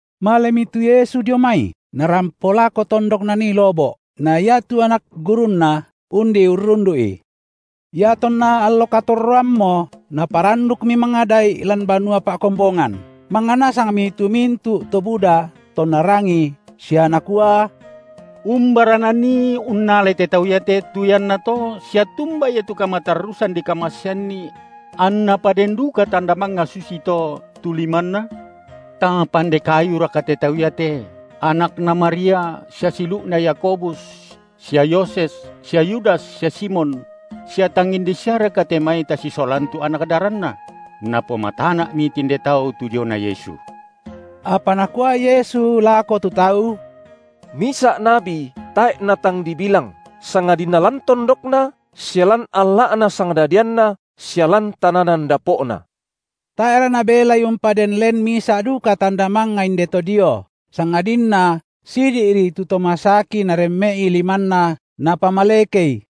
Malemi tu Yesu dio mai, Narampo lako tondok Nanii lobo’; na iatu anak gurunNa undi urrundu’I. Iatonna allo katorroammo Naparandukmi mangada’i lan banua pa’kombongan; mangnga nasangmi tu mintu’ to buda tonna rangi sia nakua: Umbara Nanii unnalai te tau iate tu iannato sia tumba ia tu kamatarrusan dikamaseanNi? Anna paden duka tanda mangnga susito, tu limanNa? Tang pande kayuraka te Tau iate, anakna Maria sia siulu’na Yakobus sia Yoses sia Yudas sia Simon? Sia tang inde siaraka te mai tasisolan tu anak daranNa? Napomatana’mi tinde tau tu diona Yesu. Apa Nakua Yesu lako tu tau: Misa’ nabi tae’ natang dibilang, sangadinna lan tondokna sia lan alla’na sangdadianna sia lan tananan dapo’na. Tae’ra Nabelai umpaden len misa’ duka tanda mangnga indeto dio, sangadinna sidi’ri tu to masaki Naremme’i limanNa Napamalekei.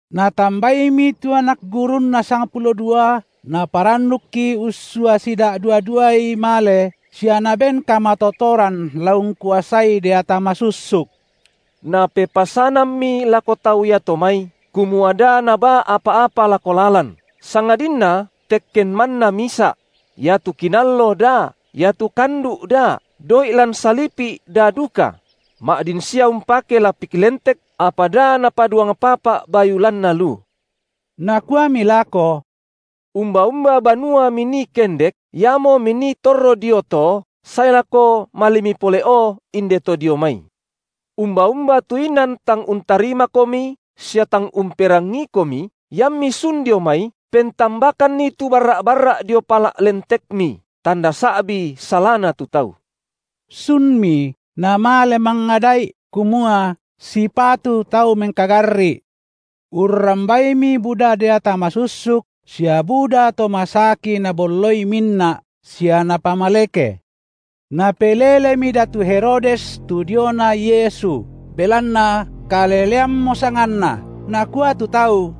Natambaimi tu anak gurunNa sangpulo dua, Naparandukki ussua sida’dua-duai male sia Naben kamatotoran la ungkuasai deata masussuk. Napepasanammi lako tau iato mai, kumua da nabaa apa-apa lako lalan, sangadinna tekken manna misa’; iatu kinallo da, iatu kandu’ da, doi’ lan salipi’ da duka; ma’din sia umpake lapik lentek, apa da napaduang papa’ bayu lanna lu. Nakuami lako: Umba-umba banua minii kendek, iamo minii torro dio to sae lako malemi pole’o indeto dio mai. Umba-umba tu inan tang untarimakomi sia tang umperangiikomi, iammi sun dio mai, pentambakanni tu barra’-barra’ dio pala’ lentekmi, tanda sa’bi salana tu tau. Sunmi namale mangada’i, kumua sipatu tau mengkagarri’. Urrambaimi buda deata masussuk sia buda to masaki nabolloi minna’ sia napamaleke. Napelelemi datu Herodes tu diona Yesu, belanna kaleleammo sanganNa, nakua tu tau: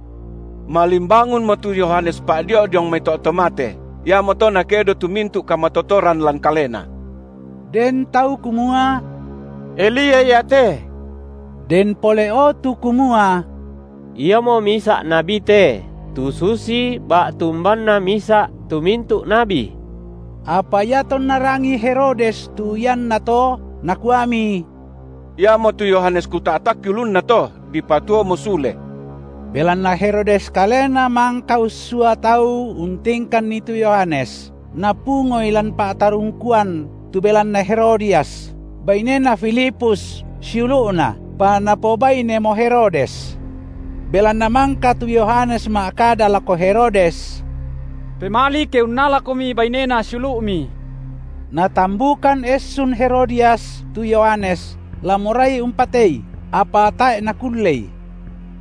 Malimbangunmo tu Yohanes Pa’dio’ diong mai to’ to mate, iamoto nakedo tu mintu’ kamatotoran lan Kalena. Den tau kumua: Elia iate; den pole’o tu kumua: Iamo misa’ nabi te tu susi ba’tu umbanna misa’ tu mintu’ nabi. Apa iatonna rangii Herodes tu iannato, nakuami: Iamotu Yohanes kuta’takki ulunna to, dipatuomo sule. Belanna Herodes kalena mangka ussua tau untingkanni tu Yohanes, napungoi lan pa’tarungkuan tu belanna Herodias, bainena Filipus siulu’na, pa napobainemo Herodes. Belanna mangka tu Yohanes ma’kada lako Herodes: Pemali ke unnalakomi bainena siulu’mi. Natambukan essun Herodias tu Yohanes la morai umpatei, apa tae’ nakullei.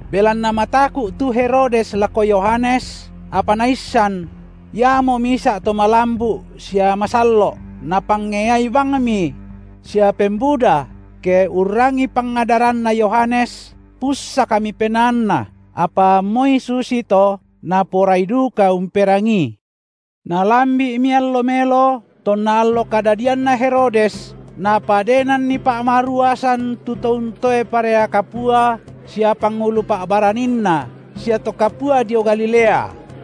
Belanna mataku’ tu Herodes lako Yohanes, apa naissan: iamo misa’ to malambu’ sia masallo’, napangeai bangmi; sia pembuda ke urrangii pangadaranna Yohanes, pussakmi penaanna, apa moi susito naporai duka umperangii. Nalambi’mi allo melo, tonna allo kadadianna Herodes napadenanni pa’maruasan tu to untoe parea kapua sia pangulu pa’baraninna sia to kapua dio Galilea.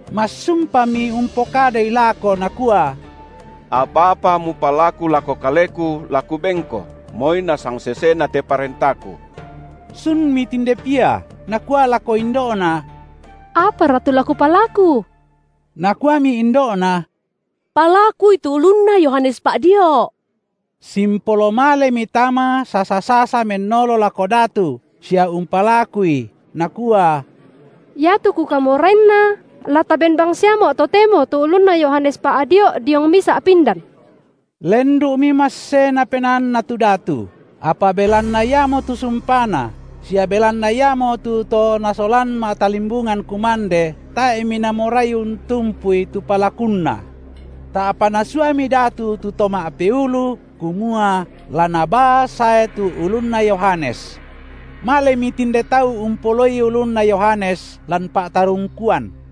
Massumpami umpokadai lako nakua: Apa-apa mupalaku lako kaleku, la kubenko, moi na sangsesena te parentaku. Sunmi tinde pia nakua lako indo’na: Apara tu la kupalaku? Nakuami indo’na: Palakui tu ulunna Yohanes Pa’dio’. Simpolo malemi tama sasa-sasa mennolo lako datu sia umpalakui, nakua: Iatu kukamorainna, la taben bangsiamo’ totemo tu ulunna Yohanes Pa’dio’ diong misa’ pindan. Lendu’mi massena penaanna tu datu, apa belanna iamotu sumpana sia belanna iamotu to nasolan ma’talimbungan kumande, tae’mi namorai untumpui tu palakunna. Ta’pa nasuami datu tu to ma’peulu kumua la nabaa sae tu ulunna Yohanes. Maleni tinde tau umpoloi ulunna Yohanes lan pa’tarungkuan.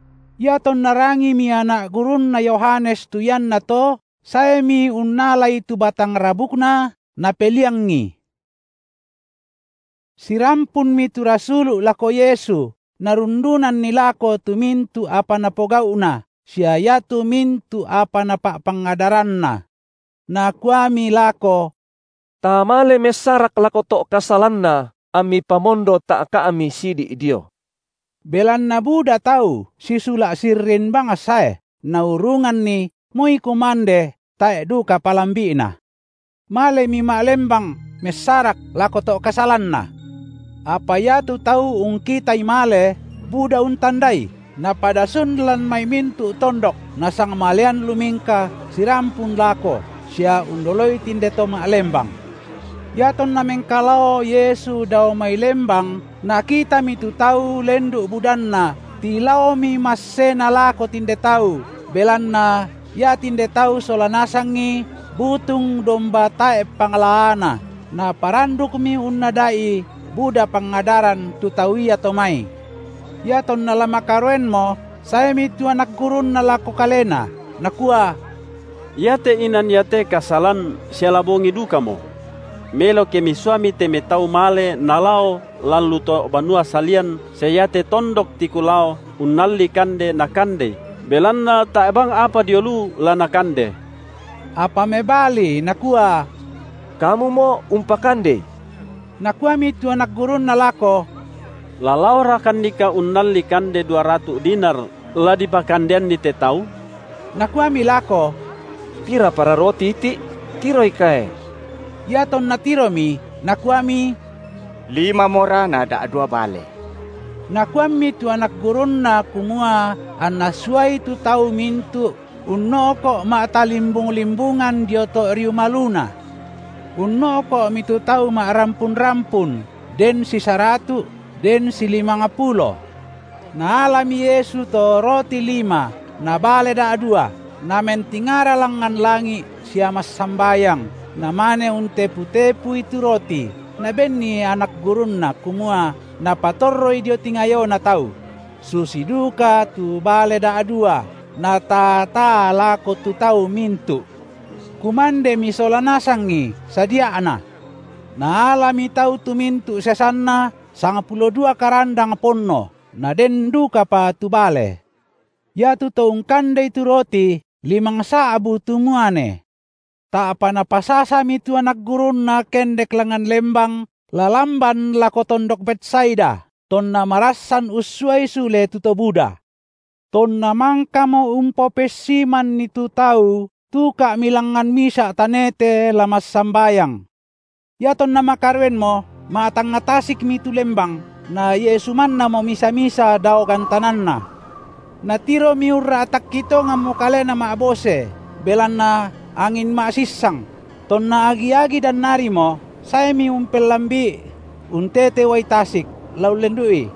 Iatonna rangimi anak gurunna Yohanes tu iannato, saemi unnalai tu batang rabukna, napeliangi. Sirampunmi tu rasulu’ lako Yesu narundunanni lako tu mintu’ apa napogau’na sia iatu mintu’ apa napa’pangadaranna. Nakuami lako: Ta male messarak lako to’ kasalanna ammi pamondo ta’ka’mi sidi’ dio. Belanna buda tau sisula’ sirrin bang sae, naurunganni moi kumande tae’ duka palambi’na. Malemi ma’lembang messarak lako to’ kasalanna. Apa iatu tau ungkitai male, buda untandai, napada sun lan mai mintu’ tondok nasangmalean lumingka sirampun lako sia undoloi tinde to ma’lembang. Iatonna mengkalao Yesu dao mai lembang, Nakitami tu tau lendu’ budanna tilaomi massena lako tinde tau, belanna ia tinde tau sola nasangi butung domba tae’ panglaana, Naparandukmi unnada’i buda pangadaran tu tau iato mai. Iatonna la makaroenmo saemi tu anak gurunNa lako Kalena, nakua: Iate inan iate kasalan sia la bongi dukamo. Melo ke Misuami te mai tau male nalao lan lu to’ banua salian sia iate tondok tiku lao unnalli kande nakandei, belanna tae’ bang apa dio lu la nakande. Apa mebali Nakua: Kamumo umpakandei. Nakuami tu anak gurunNa lako: La laorakannika unnalli kande dua ratu’ dinar la dipakandeanni te tau? Nakuami lako: Pirapara roti iti’? Tiroikae. Iatonna tiromi, nakuami: Limamora na da’dua bale. Nakuammi tu anak gurunNa kumua anna suai tu tau mintu’ unno’ko’ ma’ta- limbung-limbungan dio to’ riu maluna. Unno’ko’mi tu tau ma’rampun-rampun, den sisaratu’, den silimangpulo. Naalami Yesu to roti lima na bale da’dua, Namentingara langngan langi’ sia massambayang, Namane untepu-tepui tu roti, Nabenni anak gurunNa, kumua napatorroi dio tingayona tau; susi duka tu bale da’dua Nataa-taa lako tu tau mintu’. Kumandemi sola nasangi sadia’na. Naalami tau tu mintu’ sesanna sangpulo dua karandang ponno, naden dukapa tu bale. Iatu to ungkandei tu roti limangsa’bu tu muane. Ta’pa Napasasami tu anak gurunNa kendek langngan lembang la lamban lako tondok Betsaida, tonna marassan ussuai sule tu to buda. Tonna mangkamo umpopessimanni tu tau, tuka’mi langngan misa’ tanete la massambayang. Iatonna makaroenmo ma’tangnga tasikmi tu lembang, na Yesu mannamo misa-misa dao gantananna. Natiromi urra’takki tonganmo kalena ma’bose, belanna angin ma’sissang; tonna agi-agi dannarimo, saemi umpellambi’i untete uai tasik, la ullendu’i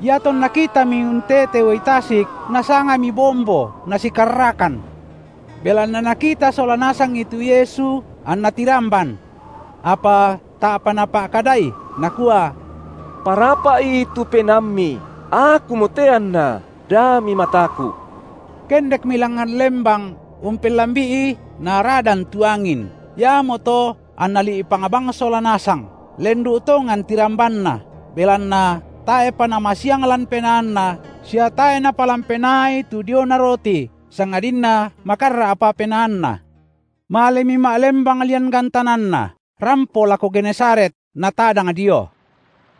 Iatonna kitami untete uai tasik, nasangami bombo, nasikarrakan, belanna nakita sola nasangi tu Yesu, anna tiramban. Apa ta’pa Napa’kadai, Nakua: Parapa’i tu penaammi, Akumote anna, da mimataku’. Kendekmi langngan lembang umpellambi’i, naradan tu angin, iamoto anna li’pang bang sola nasang, lendu’ tongan tirambanna, belanna tae’pa namasiang lan penaanna sia tae’ napalan penaai tu diona roti, sangadinna makarra’pa penaanna. Malemi ma’lembang lian gantananna, rampo lako Genesaret, natadang dio.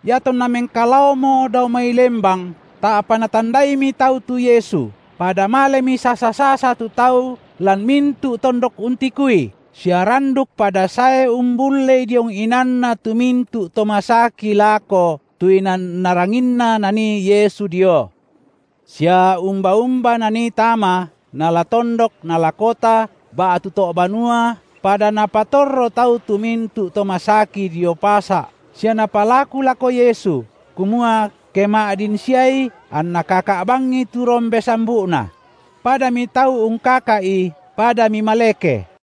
Iatonna mengkalaomo dao mai lembang, ta’pa natandaimi tau tu Yesu, pada malemi sasa-sasa tu tau lan mintu’ tondok untikui, sia randuk pada sae umbullei diong inanna tu mintu’ to masaki lako tu inan naranginna Nanii Yesu dio. Sia umba-umba Nanii tama, nala tondok nala kota ba’tu to’ banua, pada napatorro tau tu mintu’ to masaki dio pasa’ sia napalaku lako Yesu, kumua ke ma’din siai anna kaka’ bangi tu rombe sambu’Na; padami tau ungkaka’I padami maleke.